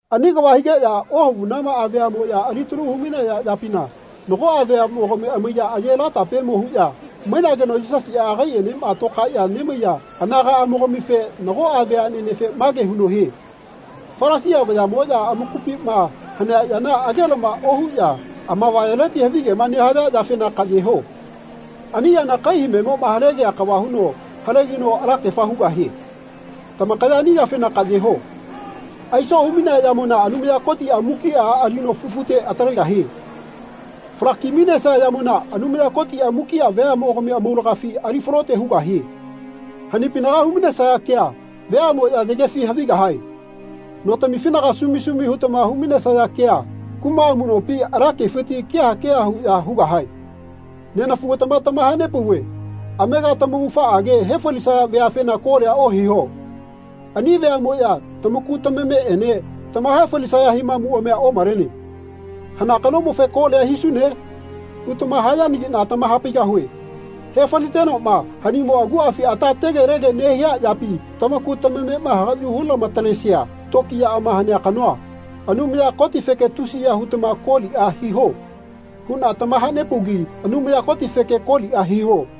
Ani kava higeꞌya ohavunamaꞌa veaꞌmoꞌya alitalu humainaya yapina nagoꞌa veaꞌmogami amaiya aye latapemo huꞌya mainageno Yisasiꞌa agaiꞌenema tokaeꞌya nemaiya anagaꞌamogamife nagoꞌa veaꞌnenefe mage huno hie “Falasia vayaꞌmoꞌya amakupima hanea yana agelama ohuꞌya amavayaleti havigema nehaya yafena kaꞌyeho. Ani yana kai hamemoꞌma halegia kava huno halegino alakefa hugahie. Tamakaya ani yafena kaꞌyeho. Aiso humainea yamona Anumaya Kotiꞌa mukiꞌa alino fufute atalegahie. Falaki-mainesia yamona Anumaya Kotiꞌa mukiꞌa veaꞌmogami amaulagafi ali falote hugahie. Hanipinaga hu-mainesaya kea veaꞌmoꞌya yagefi havigahae. Notamifinaga sumi sumi hutama hu-mainesaya kea kuma amuꞌnopiti ala kefiti keha keha huꞌya hugahae.” Nenafugatama tamahanepauve amega tamaugafaꞌage hefalisaya veafena kolia ohiho. Ani veaꞌmoꞌya tamaku tamameꞌene tamahae falisaya himamuꞌamia omalene. “Hana kanomofe kolia hisune?” hutama hayanagiꞌna tamahapaigahue. Hefalitenoꞌma hanimo aguꞌafi ata tegelege nehia yapi tamaku tamamema hagaꞌyu hulama-talesia tokiyaꞌama hanea kanoa, Anumaya Kotifeke tusiya hutama koliꞌa hiho huꞌna tamahanepaugi Anumaya Kotifeke koliꞌa hiho.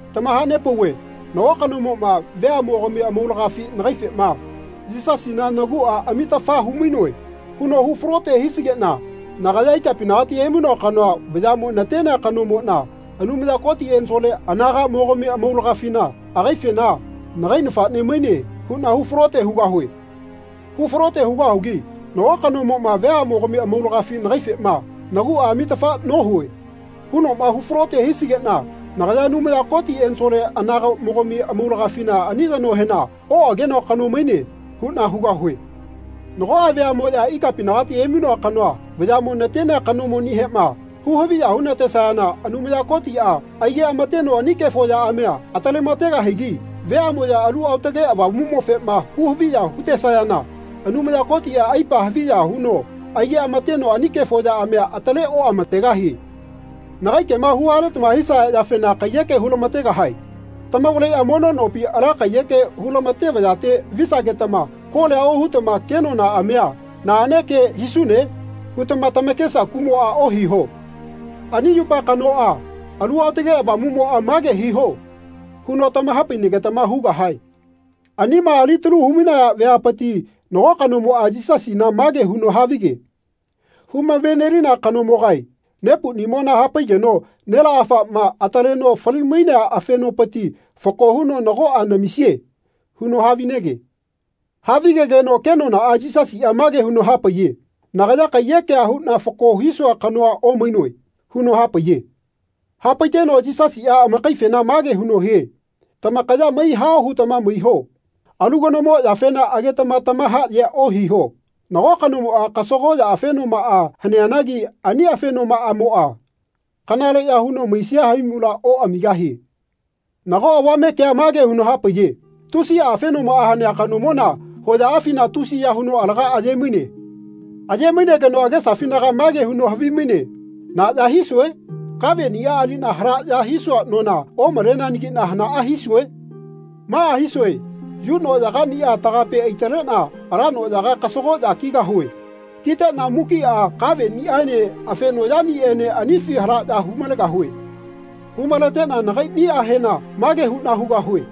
Tamahanepauve nago kanomoꞌma veaꞌmogami amaulagafi nagaifema “Yisasina naguꞌa amitafa humainoe.” huno hu falote hisigeꞌna nagaya ikapinagati emainoa kanoa vayaꞌmo natenea kanomoꞌna Anumaya Koti ensole anagaꞌmogami amaulagafina agaifena “Nagai nafaꞌne maine.” huꞌna hu falote hugahue. Hu falote hugahugi nago kanomoꞌma veaꞌmogami amaulagafi nagaifema “Naguꞌa amitafa nohue.” hunoꞌma hufalote hisigeꞌna nagaya Anumaya Koti ensole anagaꞌmogami amaulagafina ani kanohena “Oꞌagenoa kano maine.” huꞌna hugahue. Nagoꞌa veaꞌmoꞌya ikapinagati emainoa kanoa vayaꞌmo natenea kanomonihema hu-haviya hunatesayana Anumaya Kotiꞌa aigeꞌamateno ani kefo yaꞌamia atalemategahigi veaꞌmoꞌya Alu Aotage Avamuꞌmofema hu-haviya hutesayana Anumaya Kotiꞌa aipa haviya huno aigeꞌamateno ani kefo yaꞌamia ataleoꞌamategahie. Nagai kema huhaletama hisaya yafena kaiyeke hulamategahae. Tamavaleꞌya mono nopi ala kaiyeke hulamate vayate visagetama kolia hutama “Kenonaꞌamia naꞌane ke hisune?” hutama tamakesa kuꞌmoꞌa ohiho. Ani yupa kanoꞌa Alu Aotage Avamuꞌmoꞌa “Mage hiho.” huno tamahapainagetama hugahae. Anima alitalu hu-mainaya veapiti nago kanomoꞌa Yisasina mage huno havige “Humavenelina kanomogae nepuꞌnimona hapaigeno nelaꞌafaꞌma ataleno fali-mainea afenopiti fako huno nagoꞌa namisie.” huno havinege. Havigegeno kenonaꞌa Yisasiꞌa mage huno hapaiye “Nagaya kaiyekea huꞌna fako hisua kanoa omainoe.” huno hapaiye. Hapaiteno Yisasiꞌa amakaifena mage huno hie “Tamakaya maihao hutama maiho. Alu kanomo yafena agetama tamahaꞌyea ohiho. Nago kanomoꞌa kasagoꞌya afenomaꞌa haneanagi ani afenomaꞌamoꞌa kanaleꞌya huno maisia haimula oꞌamigahie.” Nago avame kea mage huno hamapaiye “Tusiꞌa afenomaꞌa hanea kanomona hoyaꞌafina tusiya huno alaga aye-maine. Aye-mainegeno agesafinaga mage huno havimaine ‘Na ya hisue? Kaveꞌnia aliꞌna halaꞌya hisua nona omaleanagiꞌna hanaꞌa hisue?’ Maꞌa hisue. Yu noꞌyagaꞌniꞌa tagape aitaleteꞌna ala noꞌyaga kasagoꞌya kigahue. Kiteꞌna mukiꞌa kaveꞌniꞌaene afenoꞌyaniꞌaene anifi halaꞌya hu-malegahue. Hu-maleteꞌna nagaiꞌnihena mage huꞌna hugahue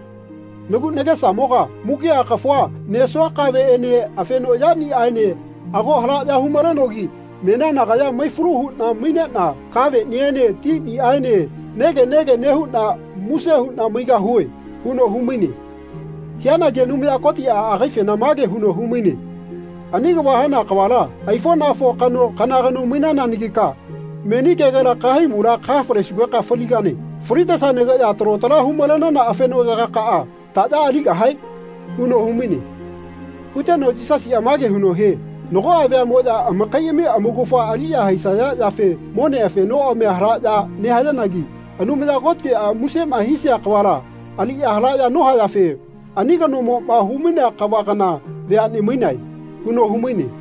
‘Nagu nagesamoga mukiꞌa kafua nesua kaveꞌene afenoꞌyaniꞌaene ago halaꞌya hu-malenogi menia nagaya maifalu huꞌna maineꞌna kaveꞌniene tiniꞌaene nege nege nehuꞌna muse huꞌna maigahue.’ huno humaine. Hianagi Anumaya Kotiꞌa agaifena mage huno humaine ‘Ani kava hana kavala aifoꞌnafo kano kana kano mainananagika meni kegela kahaimula kahafalesugeka faligane. Falitesanageꞌya talo tala humalenana afenoꞌyagakaꞌa taꞌya aligahae?’ huno humaine. Huteno Yisasiꞌa mage huno hie nagoꞌa veaꞌmoꞌya amakaiꞌami amaugafa aliꞌya haisaya yafe mone afenoꞌamia halaꞌya nehayanagi Anumaya Kotiꞌa musema hisia kavala aliꞌya halaꞌya nohayafe ani kanomoꞌma humainea kava kana veaꞌne mainae.” huno humaine.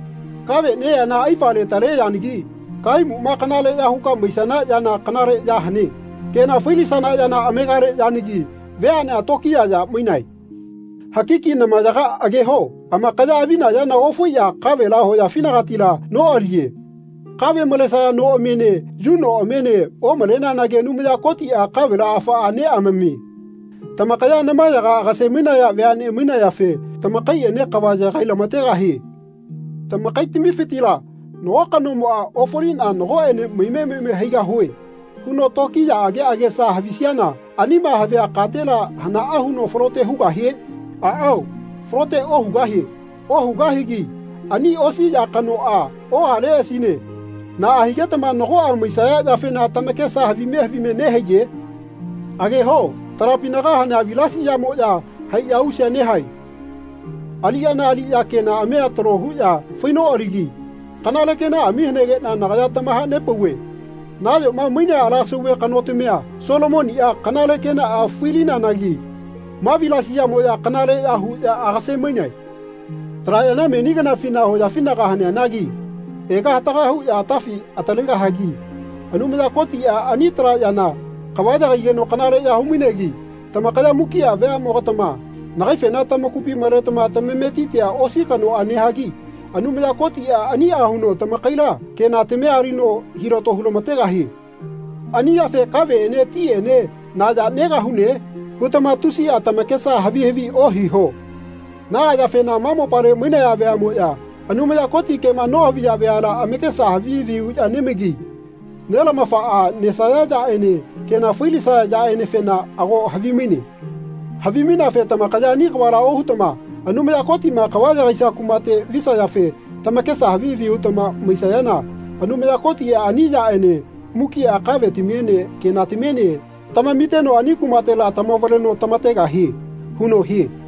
Kave neyana aifa letale yanagi kahaimuna kanaleꞌya huka maisana yana kanale ya hane. Kena failisana yana amegale yanagi veaꞌnea tokiya ya mainae. Hakiki namayaga ageho. Amakaya avina yana ofaiꞌya kavela hoyafinagatila noꞌaliye. Kave malesaya noꞌamiene yu noꞌamiene omaleneanagi Anumaya Kotiꞌa kavela afaꞌa neꞌamamie. Tamakaya namayaga amakase-mainaya veaꞌne mainayafe tamakaiꞌene kava yagailamategahie. Tamakaitamifitila nago kanomoꞌa ‘Ofaliꞌna nagoꞌene maime maime haigahue.’ huno tokiyaꞌage agesa havisiana anima havia katela hanaꞌa huno falote hugahie? Aꞌao falote ohugahie Ohugahigi ani osi ya kanoꞌa ohaleꞌasine naꞌa higetama nagoꞌa maisaya yafena tamakesa havime havime nehaiye? Ageho talapinaga hanea vilasiyamoꞌya haiꞌya ausea nehae. Aliꞌyana aliꞌya kenaꞌamia talo huꞌya fainoꞌaligi kanale kenaꞌami hanegeꞌna nagaya tamahanepauve nayoma mainea ala sauve kanotamia Solomoniꞌa kanale kenaꞌa failianagi ma vilasiyamoꞌya kanaleꞌya huꞌya agase-mainae. Tala yana meni kanafina hoyafina haneanagi ega hataga huꞌya atafi atalegahagi Anumaya Kotiꞌa ani tala yana kava yagaigeno kanaleꞌya humainegi tamakaya mukiꞌa veaꞌmogatama nagaifena tamakupi maletama tamametitia osi kanoꞌa nehagi Anumaya Kotiꞌa aniꞌa huno tamakaila kenatamia alino hilato hulamategahie. Ani yafe ‘Kaveꞌene tiꞌene na ya negahune?’ hutama tusiꞌa tamakesa havi havi ohiho. Naꞌa yafena ma mopale mainaya veaꞌmoꞌya Anumaya Koti kema nohaviya veala amakesa havi havi huꞌya nemaigi Nelamafaꞌa nesaya yaꞌene kena failisaya yaꞌenefena ago havimaine. Havimaineafe tamakaya ani kavala ohutama Anumaya Kotiꞌma kava yagaisia kumate visayafe tamakesa havi havi hutama maisayana Anumaya Kotiꞌa ani yaꞌene mukiꞌa kavetamiene kenatamiene tamamiteno ani kumatela tamavaleno tamategahie.” huno hie.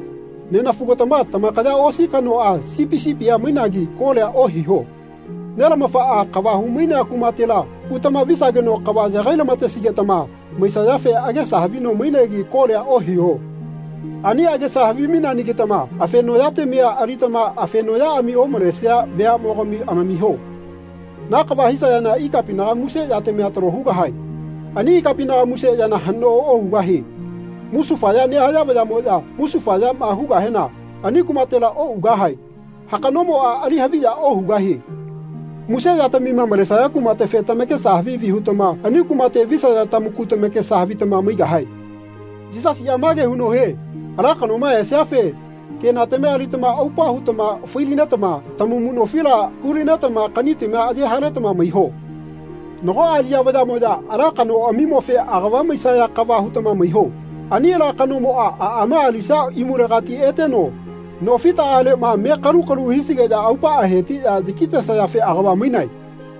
Nenafugatama tamakaya osi kanoꞌa sipi sipia mainagi kolia ohiho. Nelamafaꞌa kava humainea kumatela utama visageno kava yagailama-tesigetama maisayafe agesa havino mainegi kolia ohiho. Ani agesa havimaineanagitama afenoꞌyatamia alitama afenoꞌyaꞌami omalesia veaꞌmogami amamiho. Na kava hisayana ikapinaga muse yatamia talo hugahae. Ani ikapinaga muse yana haꞌno ohugahie. Musufaya nehaya vayaꞌmoya musufayama hugahena ani kumatela oꞌugahae. Hakaꞌnomoꞌa ali haviya ohugahie. Muse yatamima malenesaya kumatefe tamakesa havi havi hutama ani kumate visaya tamaku tamakesa havitama maigahae. Yisasiꞌa mage huno hie “Ala kanoma esiafe kenatamia alitama aupa hutama failinetama tamamu nofila hulinetama kaꞌnitamia aye haletama maiho. Nagoꞌa aliꞌya vayaꞌmoꞌya ala kanoꞌamimofe agava maisaya kava hutama maiho. Ani ala kanomoꞌa aꞌma alisia imulegati eteno no fitaꞌaleꞌma me kalu-kalu hisigeꞌya aupaꞌa hetiꞌya yakitesayafe agava mainae.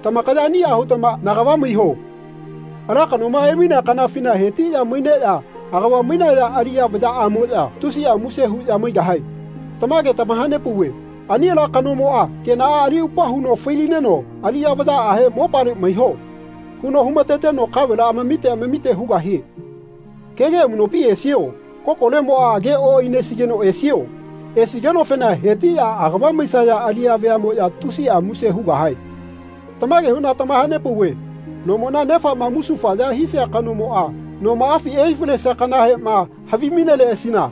Tamakaya aniꞌa hutama nagava maiho. Ala kanoma emainea kanafina hetiꞌya maineꞌya agavama mainaya aliꞌya vayaꞌamoꞌya tusiꞌa muse huꞌya maigahae. Tamage tamahanepauve ani ala kanomoꞌa kenaꞌa ali aupa huno failineno aliꞌya vayaꞌahe ‘Mopale maiho.’ huno humateteno kavela amamite amamite hugahie. Kege amuꞌnopi esio? Kokolemoꞌa agea oꞌainesigeno esio? Esigenofena hetiꞌya agava maisaya aliꞌya veaꞌmoꞌya tusiꞌa muse hugahae. Tamage huꞌna tamahanepauve nomona nefaꞌma musufaya hisia kanomoꞌa nomaꞌafi ehai falesia kanahema havimaineleꞌasina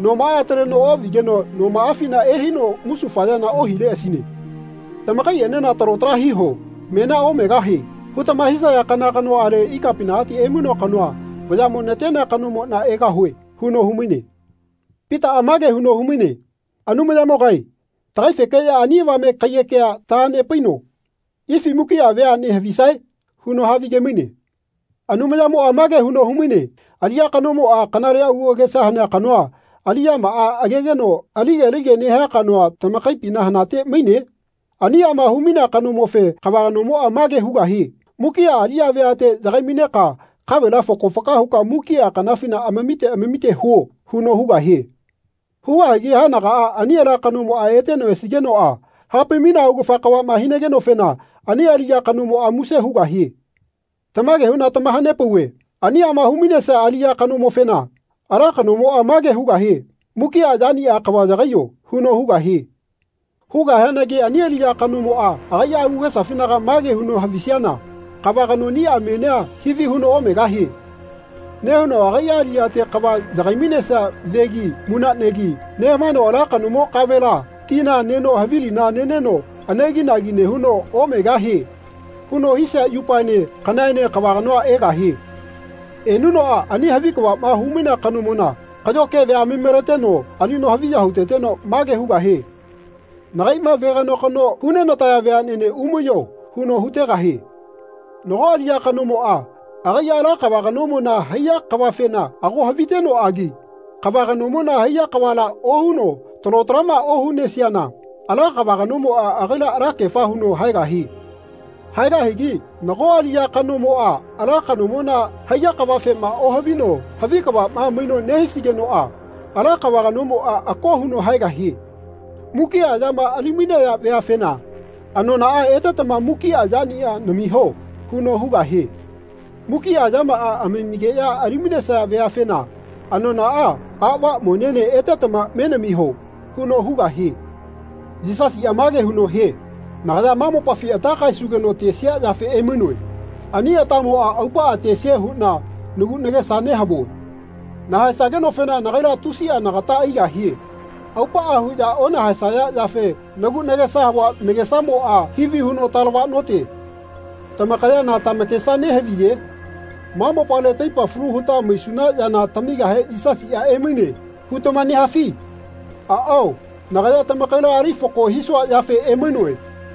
nomaꞌa ataleno oꞌvigeno nomaꞌafina ehaino musufayana ohileꞌasine. Tamakaiꞌenena talo tala hiho. ‘Menia omegahie.’ hutama hisaya kana kanoꞌale ikapinagati emainoa kanoa vayaꞌmo natenea kanomoꞌna egahue.” huno humaine. Pitaꞌa mage huno humaine “Anumayamogae tagaifekeꞌya ani avame kaiyekea tahanepaino ifi mukiꞌa veaꞌne havisae?” huno havigemaine. Anumayamoꞌa mage huno humaine “Aliꞌya kanomoꞌa kanale agu agesa hanea kanoa aliꞌyamaꞌa agegeno alige alige nehia kanoa tamakaipina hanate maine? Aniꞌama humainea kanomofe kava kanomoꞌa mage hugahie ‘Mukiꞌa aliꞌya veate yagai-maineka kavela fako faka huka mukiꞌa kanafina amamite amamite huo.’ huno hugahie. Hugahigi haenagaꞌa ani ala kanomoꞌa eteno esigenoꞌa hapai-mainea augafa kavaꞌma hinagenofena ani aliꞌya kanomoꞌa muse hugahie. Tamage huꞌna tamahanepauve aniꞌama humainesia aliꞌya kanomofena ala kanomoꞌa mage hugahie ‘Mukiꞌa yaniꞌa kava yagaiyo.’ huno hugahie. Hugahianagi ani aliꞌya kanomoꞌa agaiꞌa agesafinaga mage huno havisiana ‘Kava kanoꞌnia menia hivi huno omegahie.’ nehuno agaiꞌa aliꞌyate kava yagai-mainesia vegi munaꞌnegi nehamaeno ala kanomo kavela tina neno havilina neno aneginagi nehuno ‘Omegahie.’ huno hisia yupaene kanaꞌaene kava kanoa egahie. Enunoꞌa ani havi kavaꞌma humainea kanomona kaꞌyo kevia ami-maleteno alino haviya huteteno mage hugahie nagaiꞌma veganokano hunenataya veaꞌnene umaiyo huno hutegahie. Nago aliꞌya kanomoꞌa agaiꞌa ala kava kanomona haiya kavafena ago havitenoꞌagi kava kanomona haiya kavala ohuno talo talaꞌma ohunesiana ala kava kanomoꞌa agaila alakefa huno haegahie. Haegahigi nago aliꞌya kanomoꞌa ala kanomona haiya kavafema ohavino havi kavaꞌma maino nehisigenoꞌa ala kava kanomoꞌa ako huno haegahie. Mukiꞌa yama ali-mainaya veafena ‘Anonaꞌa etetama mukiꞌa yaniꞌa namiho.’ huno hugahie. Mukiꞌa yamaꞌa amamigeꞌya ali-mainesaya veafena ‘Anonaꞌa aꞌva monene etetama menamiho.’ huno hugahie.” Yisasiꞌa mage huno hie “Nagaya ma mopafi ata kaesugeno tesia yafe emainoe. Ani atamoꞌa aupaꞌa tesie huꞌna nagu nagesa nehavue. Nahaesagenofena nagaila tusiꞌa nagata aigahie. Aupaꞌa huꞌya onahaesaya yafe nagu nagesa havua nagesamoꞌa hivi huno talavaꞌnote. Tamakaya na tamakesa nehaviye? ‘Ma mopale taipa falu huta maisuna yana tamigahe Yisasiꞌa emaine.’ hutama nehafi? Aꞌao nagaya tamakaila ali fako hisua yafe emainoe.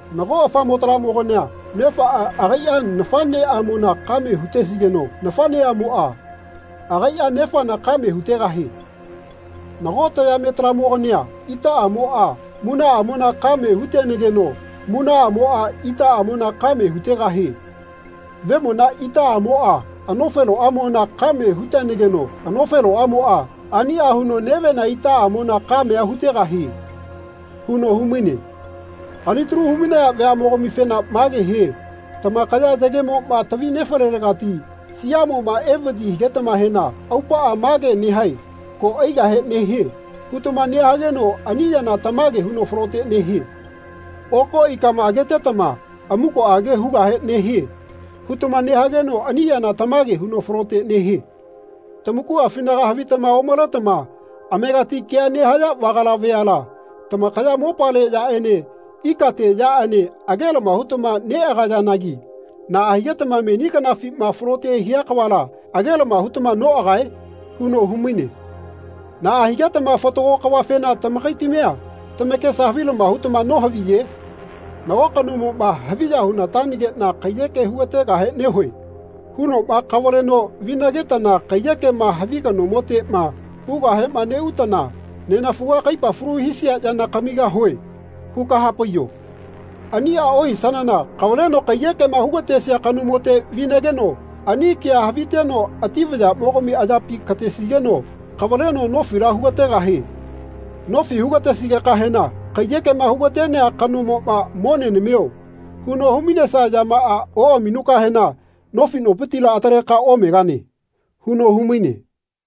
Mago afamotalamogania nefaꞌa agaiꞌa nafaꞌnemona kame hutesigeno nafaꞌneꞌamoꞌa agaiꞌa nefana kamea hutegahie. Nago tayametalamogania itaꞌamoꞌa munaꞌamona kame hutenageno munaꞌamoꞌa itaꞌamona kamea hutegahie. Vemona itaꞌamoꞌa anofeloꞌamona kame hutenageno anofeloꞌamoꞌa aniꞌa huno nevena itaꞌamona kamea hutegahie.” huno humaine. Alitalu humainaya veaꞌmogamifena mage hie “Tamakaya yagemoꞌma tavi nefalelegati siaꞌmoꞌma evaꞌyi higetamahena aupaꞌa mage nehae ‘Ko aigahe nehie.’ hutama nehageno ani yana tamage huno falote nehie. Oko ikama agetetama ‘Amukoꞌage hugahe nehie.’ hutama nehageno ani yana tamage huno falote nehie. Tamakuꞌafina havitama omaletama amegati kea nehaya vagala veala tamakaya mopale yaꞌene ikate yaꞌene agelama hutama neꞌagayanagi naꞌa higetama meni kanafima falote hia kavala agelama hutama noꞌagae?” huno humaine. “Naꞌa higetama fatago kavafena tamakaitamia tamakesa havilama hutama nohaviye? Nago kanomoꞌma ‘Haviya hunatanageꞌna kaiyeke hugategahe nehue.’ hunoꞌma kavaleno vinagetana kaiyekema havi kanomoteꞌma ugahema neꞌutana ‘Nenafuga kaipa falu hisia yana kamigahue.’ huka hapaiyo. Aniꞌa ohisanana kavaleno kaiyekema hugatesia kanomote vinageno ani kea haviteno ati vayaꞌmogami ayapi katesigeno kavaleno nofila hugategahie. Nofi hugatesigekahena kaiyekema hugatenea kanomoꞌma ‘Mone namio.’ huno hu-mainesia yamaꞌa oꞌaminukahena nofi nopitila ataleka omegane.” huno humaine.